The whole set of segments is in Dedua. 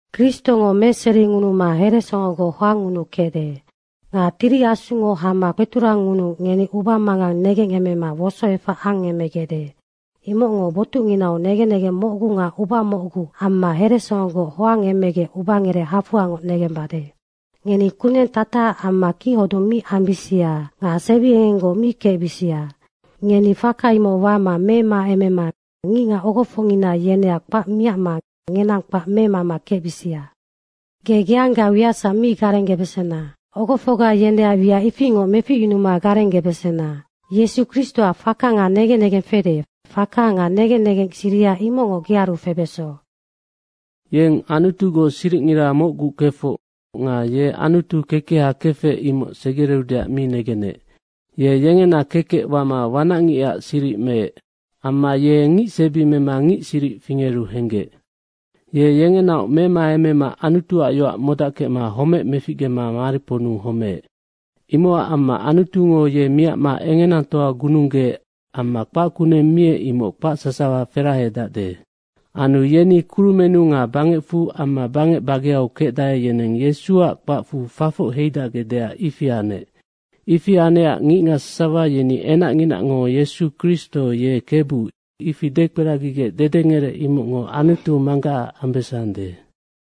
Kristongo meseringunuma heresongogoc hoangngunukecde. Nga Tiri Asungo hama kpeturangngunuu ngeni ubamangang negengemema wosoefac angemegecde. Imocngo botucnginau negen negeng mocgu nga uba mocgu amma heresongogoc hoangemegec ubangerec hafoa negembade. Ngeni kuneng tatacac amma kichodung mi ambisia nga sebiengenggoc mi kecbisia. Ngeni faka imoc wama memaemema ngicngac ogofocngina yeneac kpac miacma ngenang kpac memama kecbisia. Ge geangga wiacsac mi garenggebesena, ogofocga yeneac wiac ifingoc meficyunuma garenggebesena. Yesu Kristoac faka nga negen negeng fede, faka nga negen negeng siriha imocngo ngenearu febeso. Yeng Anutugoc siricngira mocgu kefoc nga ye Anutu kekeha kefec imoc segereudeac mi negenec. Ye yengena kekec wama wanacngicac siric meec. Amma ye ngic sebi mema ngic siric fingeru henggec. Ye yengenaoc memaemema Anutuac yoac modackecma homec meficgema mariponnu homeec. Imocac amma Anutungo ye miacma engenatoa gununggeec amma kpac kuneng miec, imoc kpac sasawa ferahedacde. Anu yeni kurumennu nga bangecfu amma bangec bageau kecdae, yeneng Yesuac kpacfu fafoc heidacgecdeac ifi anec. Ifi anecac ngicngac sasawa yeni enacnginango Yesu Kristo ye Kebu, ifi dekperagigec dedengerec imocngo Anutu Manggacac ambesande.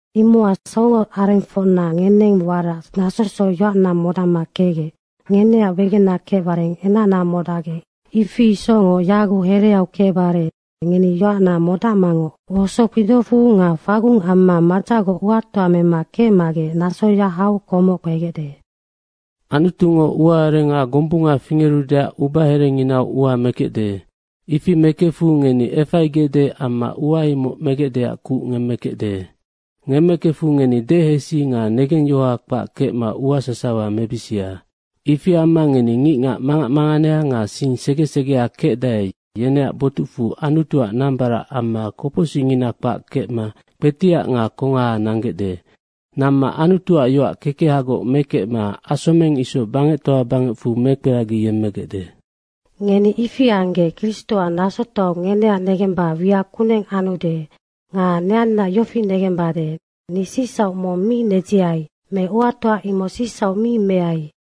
Imocac songoarengfocna, ngeneng warac nasosoc yoacna modacma kecgec, ngeneac wegena kecbare enacna modacgec ifi isocngoc yaguc hereau kecbare ngeni yoacna modacmangoc wosokpidocfu nga fagung amma madzacgoc uatoa mema kecmagec nasoya hau komoc kpegecde. Anutungo ua arenga gombunga fingerudeac ubaherenginau ua mekecde. Ifi mekefu ngeni efaigecde amma ua imoc megecdeac kuc ngemmekecde. Ngemmekefu ngeni dehesi nga negengyohoha kpac kecma ua sasawa mebisia. Ifi amma ngeni, ngicngac mangac manganea nga sing sege segea kecdae, yeneac botucfu Anutuac nambarac amma kopocsicngina kpac kecma kpetiac nga kongaha nanggecde. Namma Anutuac yoac kekehagoc mekecma asomeng isoc bangectoa bangecfu mekperagiyemmegecde. Ngeni ifi anggec, Kristoac nasotoau ngeneac negemba wiac kuneng anude nga neannaac yofi negembade, ni sicsauc mong mi nedziai me uatoa imoc sicsauc mi meai.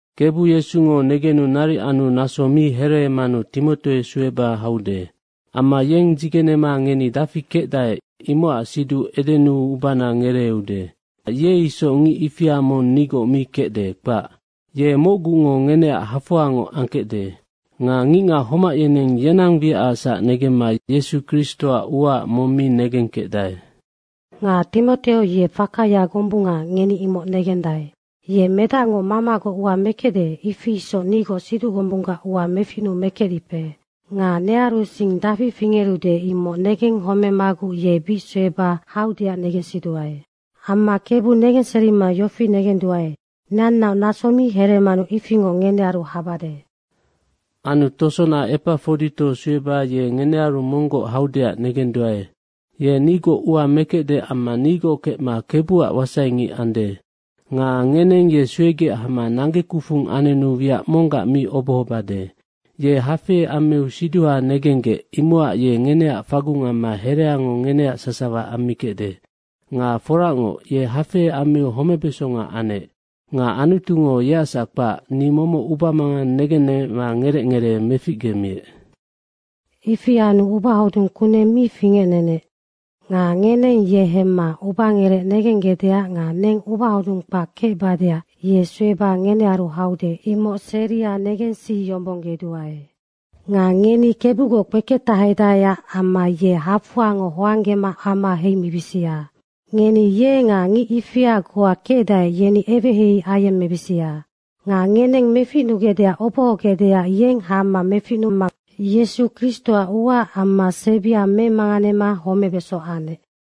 Kebu Yesungo negenu naric anu naso mi hereemanu Timoteo sueba haude. Amma yeng dzigenema ngeni dafi kecdae, imocac siduc edenuu ubana ngereeude. Nocac ye isoc ngic ifia mong nigoc mi kecde, kpac. Ye mocgungo ngeneac hafoangoc angkecde. Nga ngicngac homac yeneng yenang wiacacsac negemma Yesu Kristoac uaac mong mi negengkecdae. Nga Timoteo ye fakaya gombunga, ngeni imoc negendae. Ye medacngo mamagoc ua mekecde, if isoc nigoc siduc gombunggac ua meficnuu mekecdipe. Nga nearu sing dafi fingerude, imoc negenghomemaguc ye bic sueba haudeac negensiduae. Amma Kebu negenserima yofi negeduae, neannaoc naso mi hereemanu ifingoc ngenearu habade. Anu tosona Epafodito sueba ye ngenearu monggoc haudeac negenduae. Ye nigoc ua mekecde amma nigoc kecma Kebuac wasai ngic ande. Nga ngeneng ye suegec hama nanggekufung anenu wiac monggac mi obohobade. Ye hafei ammiu siduha negenggec, imocac ye ngeneac fagung amma hereango ngeneac sasawa ammikecde. Nga foracngoc, ye hafei ammiu homebesonga anec. Nga Anutungo yeacsac kpac, ni momoc ubamangang negennemecma ngerec ngeree meficgemiec. Ifi anu ubahodung kuneng mi fingecnenec. Nga ngeneng ye hemma ubangerec negenggecdeac nga neng ubahodunna kpac kecbadeac ye sueba ngenearu haude, imoc seria negensiyombonggeduae. Nga ngeni Kebugoc kpeketahedaeac amma ye hafoangoc hoanggema ama heimima ye nga ngic ifia goa kecdae, yeni eweheihei ayemmebisia. Nga ngeneng meficnugecdeac obohogecac yeng hama meficnuma Yesu Kristoac uaac amma sebia memanganema homebeso anecnoc.